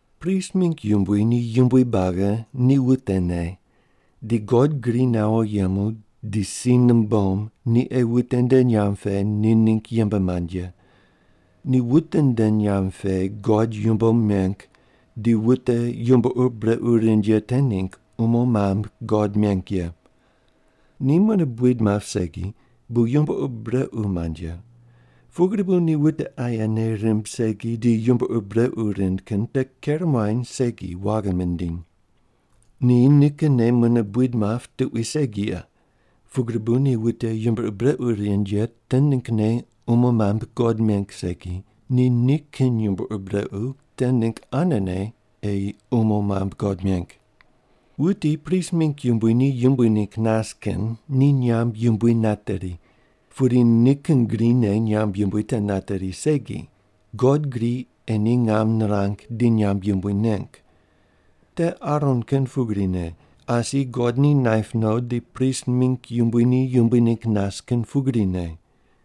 Prist mingg yumbui ni yumbui buagi ni wutene di God gri nawo yemu di si numbom ni ei wute nde nyamb pe ni ningg yembe mand ye. Ni wute nde nyamb pe God yumbo meng di wute yumbo ur brequ rind ye te ningg umo mambui God meng ye. Ni mune buid map segi bu yumbo ur brequ mand ye, pugri bu ni wute aye nei rimb segi di yumbo ur brequ rind kin te ker muany segi waghi mindiny. Ni nikinne mune buid map tuqui segi ye, pugri bu ni wute yumbo ur brequ rind ye te ninggne umo mambui God meng segi, ni nikin yumbo ur brequ te ningg anene ei umo mambui God meng. Wuti prist mingg yumbui ni yumbui ningg nas kin ni nyamb yumbui nateri, pudi nikin grine nyamb yumbui te nateri segi, God gri ei ni ngam nirang di nyamb yumbui neng. Te Aron kin pugrine, asi God ni naip no di prist mingg yumbui ni yumbui ningg nas kin pugrine.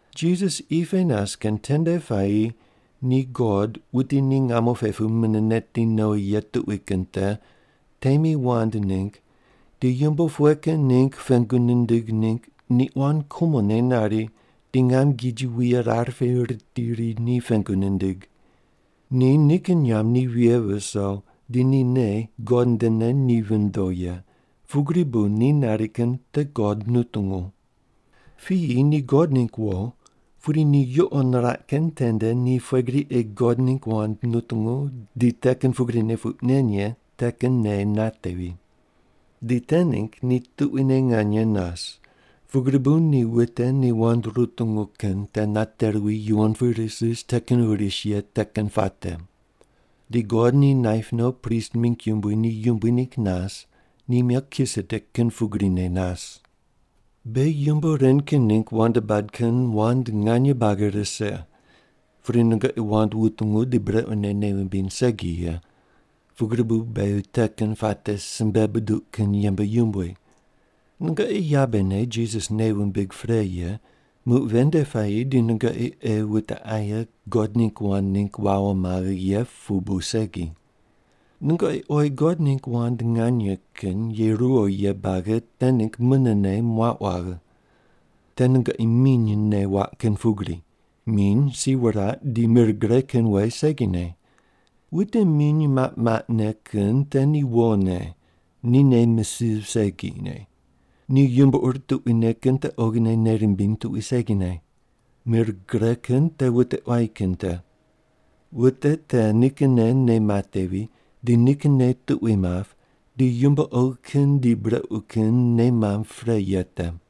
Jisas qi pe nas kin tende puayi ni God, wuti ni ngamo pe pu mune neti nowi ye tuqui kin te, temi wand ningg di yumbo pughe kin ningg pengu nindig ningg ni quan kumone nari di ngam giji wuye rar pe ritiri ri ni pengu nindig. Ni nikin nyamb ni vighe viso di ni nei God ndene ni vindo ye, pugri bu ni nari kin te God nutungu. Piyi ni God ningg wo pudi ni yuqo niraq kin tende ni pughe gri ei God ningg wand nutungu di te kin pugrine puq nen ye te kin nei natevi. Di te ningg ni tuquine nganye nas, pugri bu ni wute ni wand rutungu kin te nate ruwi yuwon pu ris ris te kin ris ye te kin puate. Di God ni naip no prist mingg yumbui ni yumbui ningg nas, ni Melkisedek kin pugrine nas. Beghi yumbo ren kin ningg wand bad kin wand nganye buagi rise, pudi nungoqi wand wutungu di brequne nei wumbiny segi ye, pugri bu beghi te kin puate simbe buduq kin yembe yumbui. Nungoqi yabene Jisas nei wumbig pre ye, muq ven nde puayi di nungoqi ei wute aye God ningg wand ningg wawo maghe ye pu bu segi. Nungoqi oyi God ningg wand nganye kin ye ruwo ye buagi te ningg munene muauq waghe. Te nungoqi minyne waq kin pugri. Miny si wuraq di mir gre kin we segine. Wute miny maq maqne kin te ni wone, ni nei misiv segine. Ni yumbo ur tuquine kin te oghine nei mimbiny tuqui segine. Mir gre kin te wute quayi kin te. Wute te nikinne nei matevi di nikin nei tuqui map di yumbo oghi kin di brequ kin nei mamb pre ye te.